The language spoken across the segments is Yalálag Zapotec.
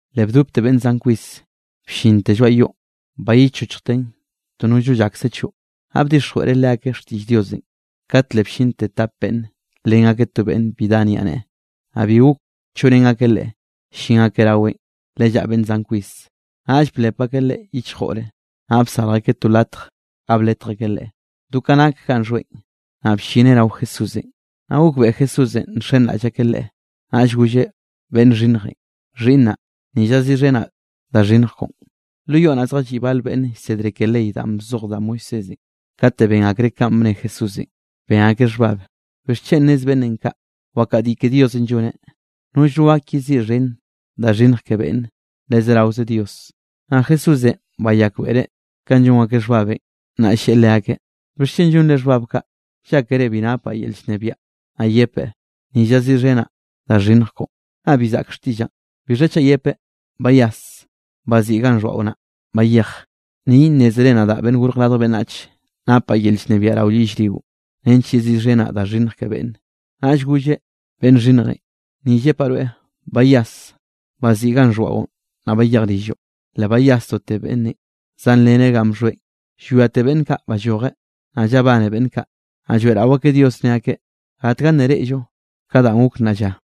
Le bdopte beꞌnn zan kwis bllinte lloaꞌ yoꞌn bayichochjten to nollno llakse choꞌ. Naꞌ bdixjweꞌreꞌ leakeꞌ xtiꞌll Diosenꞌ. Kat le bllinte tap beꞌnn nlen akeꞌ to beꞌnn bi dá niaꞌneꞌe. Naꞌ bi gok choꞌrén akeꞌ leꞌe, llin akeꞌ raweꞌn le llaꞌa beꞌnn zan kwis. Naꞌll blep akeꞌ leꞌe yichjore, naꞌ bsarj akeꞌ to latj ga bletj akeꞌ leꞌe do ka nak ganꞌ xhoeꞌn, naꞌ bllineꞌ rao Jesúsenꞌ. Naꞌ gokbeꞌe Jesúsenꞌ nxenraꞌll akeꞌ Leꞌe, naꞌll golleꞌ beꞌnn xhinnjenꞌ: —Xhiꞌnnaꞌ, ni llaziꞌxhenaꞌ da xhinnj koꞌon. Lo yoꞌ naꞌ zjalliꞌ bal beꞌnn llsedre ke ley danꞌ bzoj da Moisésenꞌ, kate ben akreꞌ kanꞌ bne Jesúsenꞌ, ben akeꞌ xhbab: “¿Bixchen nez beꞌnnenꞌ kaꞌ? Wakadiꞌ ke Diosenꞌ lloneꞌ. Nollno gak yeziꞌxhen da xhinnj ke beꞌnne, le zeraoze Dios.” Naꞌ Jesúsenꞌ bayakbeꞌreꞌ kanꞌ llon akeꞌ xhbabenꞌ, naꞌll lleꞌe leakeꞌ: —¿Bixchen llonre xhbabenꞌ kaꞌ? Llákere bi napaꞌ yel llnebiaꞌ naꞌ yepeꞌ: “Ni llaziꞌxhenaꞌ da xhinnj koꞌo”, naꞌ bi zaꞌk xtiꞌllaꞌn. ¿Bixha chaꞌ yepeꞌ: “Bayas, baziꞌi ganꞌ xhoaꞌo naꞌ bayej”? Ni nnézere, nadaꞌ, Beꞌnnenꞌ Gorj Radj Beꞌnnach napaꞌ yel llnebiaꞌ rao yellrio nench yeziꞌxhenaꞌ da xhinnj ke beꞌnne. Naꞌll golleꞌ beꞌnn xhinnjenꞌ: —Ni llepaꞌ rweꞌ, bayas, baziꞌi ganꞌ bxhoaꞌon naꞌ bayej rilloꞌ. Le bayasdote beꞌnnenꞌ, zanleneꞌ ganꞌ bxhoeꞌn, llwiate beꞌnn kaꞌ ballojeꞌ. Naꞌ llabane beꞌnn kaꞌ, naꞌ lloeꞌrao akeꞌ Dios ne akeꞌ: —Gatga nna reꞌllo ka danꞌ gok nnaꞌ lla.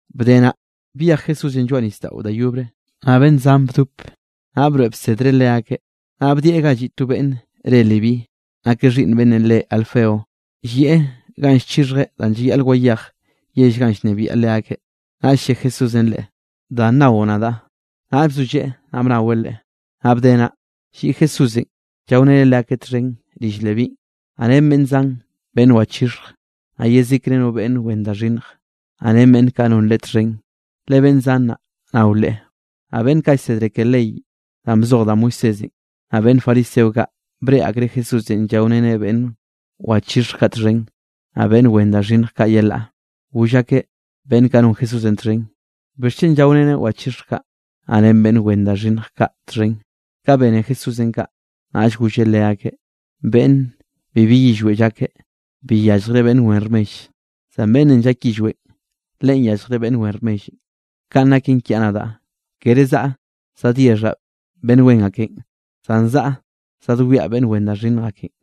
Bde naꞌ, byej Jesúsenꞌ lloaꞌ nisdaꞌon da yobre, naꞌ beꞌnn zan bdop, naꞌ broeꞌ bsedreꞌ leakeꞌ. Naꞌ bdieꞌ ga lliꞌ to beꞌnn re Leví, nakeꞌ xhiꞌnn beꞌnnenꞌ re Alfeo, llieꞌ ganꞌ llchixhjeꞌ danꞌ llayaꞌl wayej yell ganꞌ llnebiaꞌ leakeꞌ. Naꞌll lle Jesúsenꞌ leꞌe: —Da nao nadaꞌ. Naꞌll bzolleꞌe, naꞌ bnaweꞌ Leꞌe. Naꞌ bde naꞌ, lliꞌ Jesúsenꞌ llaoreneꞌ leakeꞌ txhen rill Levínꞌ, naꞌ ren beꞌnn zan beꞌnn wachixhj, naꞌ yezikre no beꞌnn wen da xhinnj, naꞌ ren beꞌnn kaꞌ non Leꞌe txhen, le beꞌnn zan naꞌ nao Leꞌe. Naꞌ beꞌnn kaꞌ llsedre ke ley danꞌ bzoj da Moisésenꞌ, naꞌ beꞌnn fariseo kaꞌ, breꞌe akreꞌ Jesúsenꞌ llaoreneꞌ beꞌnn wachixhj kaꞌ txhen, naꞌ beꞌnn wen da xhinnj kaꞌ yelaꞌ, goll akeꞌ beꞌnn kaꞌ non Jesúsenꞌ txhen: —¿Bixchen llaoreneꞌ wachixhj kaꞌ, naꞌ ren beꞌnn wen da xhinnj kaꞌ txhen? Ka bene Jesúsenꞌ kaꞌ, naꞌll golleꞌ leakeꞌ: —Beꞌnn bibi yillweꞌ llake, bi yalljreꞌ beꞌnn wen rmell, zan beꞌnnenꞌ llak yillweꞌn, leꞌen yalljreꞌ beꞌnn wen rmellenꞌ. Kanꞌ naken kiaꞌ nadaꞌ, kere zaꞌa zadyexhaꞌ beꞌnn wen akenꞌ, zan zaꞌa zadwiaꞌ beꞌnn wen da xhinnj akenꞌ.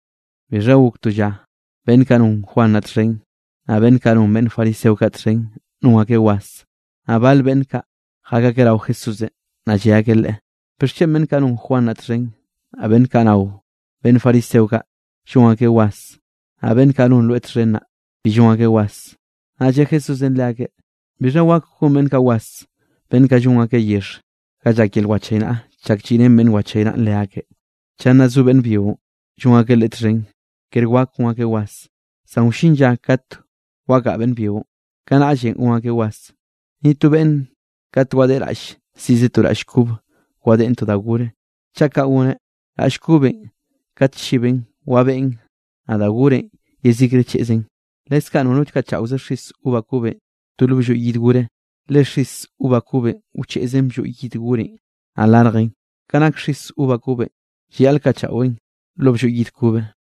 Bixha gok to lla beꞌnn kaꞌ non Juan naꞌ txhen, naꞌ beꞌnn kaꞌ non beꞌnn fariseo kaꞌ txhen non akeꞌ was, naꞌ bal beꞌnn kaꞌ jak akeꞌ rao Jesúsenꞌ, naꞌ lle akeꞌ Leꞌe: —¿Bixchen beꞌnn kaꞌ non Juan naꞌ txhen, naꞌ beꞌnn kaꞌ nao beꞌnn fariseo kaꞌ llon akeꞌ was, naꞌ beꞌnn kaꞌ non rweꞌ txhen naꞌ, bi llon akeꞌ was? Naꞌll lle Jesúsenꞌ leakeꞌ: —¿Bixha wak gon beꞌnn kaꞌ was, beꞌnn kaꞌ llon akeꞌ yexh ga llak yel wachaynaꞌa chak lliꞌrén beꞌnnenꞌ llchaynaꞌn leakeꞌ? Chak nna zo beꞌnn byionꞌ, llon akeꞌ leꞌe txhen, ker wak gon akeꞌ was. Zan wllin lla kat wagaꞌa beꞌnn byionꞌ, kanaꞌllenꞌ gon akeꞌ was. ’Ni to beꞌnn kat wadeꞌe raꞌll, siꞌzeꞌ to raꞌll kobe wadeꞌen da gorenꞌ. Chaꞌ kaꞌ goneꞌ, raꞌll kobenꞌ, kat chiben, wabeꞌn, naꞌ da gorenꞌ yezikre cheꞌzen. Leskaꞌ nono kaꞌchaꞌoze xis uva kobenꞌ to lo blloy yid gore, le xis uva kobenꞌ wcheꞌzen blloy yid gorenꞌ naꞌ larjen. Ke nak xis uva kobenꞌ llayaꞌl kaꞌchaꞌweꞌn lo blloy yid kobe.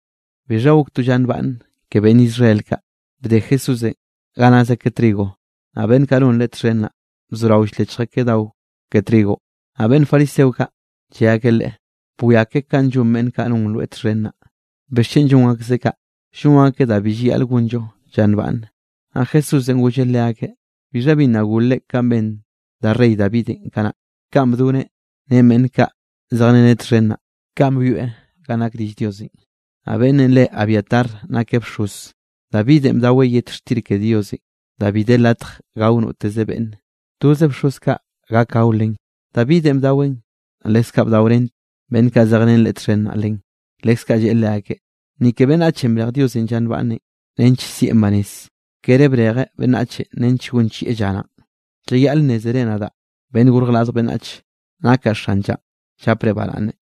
Bixha gok to lla nbaꞌnne ke beꞌnn Israel kaꞌ, bde Jesúsenꞌ ga naz akeꞌ trigo, naꞌ beꞌnn kaꞌ non Leꞌe txhen naꞌ, bzorao ll-lechj akeꞌ dao ke trigonꞌ. Naꞌ beꞌnn fariseo kaꞌ lle akeꞌ Leꞌe: —Bwiake kanꞌ llon beꞌnn kaꞌ non rweꞌ txhen naꞌ, ¿bixchen llon akzeꞌ kaꞌ? Llon akeꞌ da bi llayaꞌl gonllo lla nbaꞌnne. Naꞌ Jesúsenꞌ golleꞌ leakeꞌ: —¿Bixha bi nna golre kanꞌ ben da rey Davidenꞌ kanaꞌ? Ka bdoneꞌ ren beꞌnn kaꞌ zejreneꞌ txhen naꞌ. Kanꞌ byoeꞌ ganꞌ nak rill Diosenꞌ, naꞌ beꞌnnenꞌ re Abiatar nakeꞌ bxoz, Davidenꞌ bdaweꞌ yet xtir ke Diosenꞌ da bi de latj gao noteze beꞌnne, toze bxoz kaꞌ gak gao len; Davidenꞌ bdaweꞌn, naꞌ leskaꞌ bdaorén beꞌnn kaꞌ zejrén leꞌe txhen naꞌ len. Leskaꞌ lleꞌe leakeꞌ: —Ni ke beꞌnnachenꞌ brej Diosenꞌ lla nbaꞌnne nench sieꞌn banez, kere brejeꞌ beꞌnnachenꞌ nench gonchieꞌ lla naꞌn. Llayaꞌl nnézere nadaꞌ, Beꞌnnenꞌ Gorj Radj Beꞌnnach, nakaꞌ xan llanꞌ llapre baraꞌnne.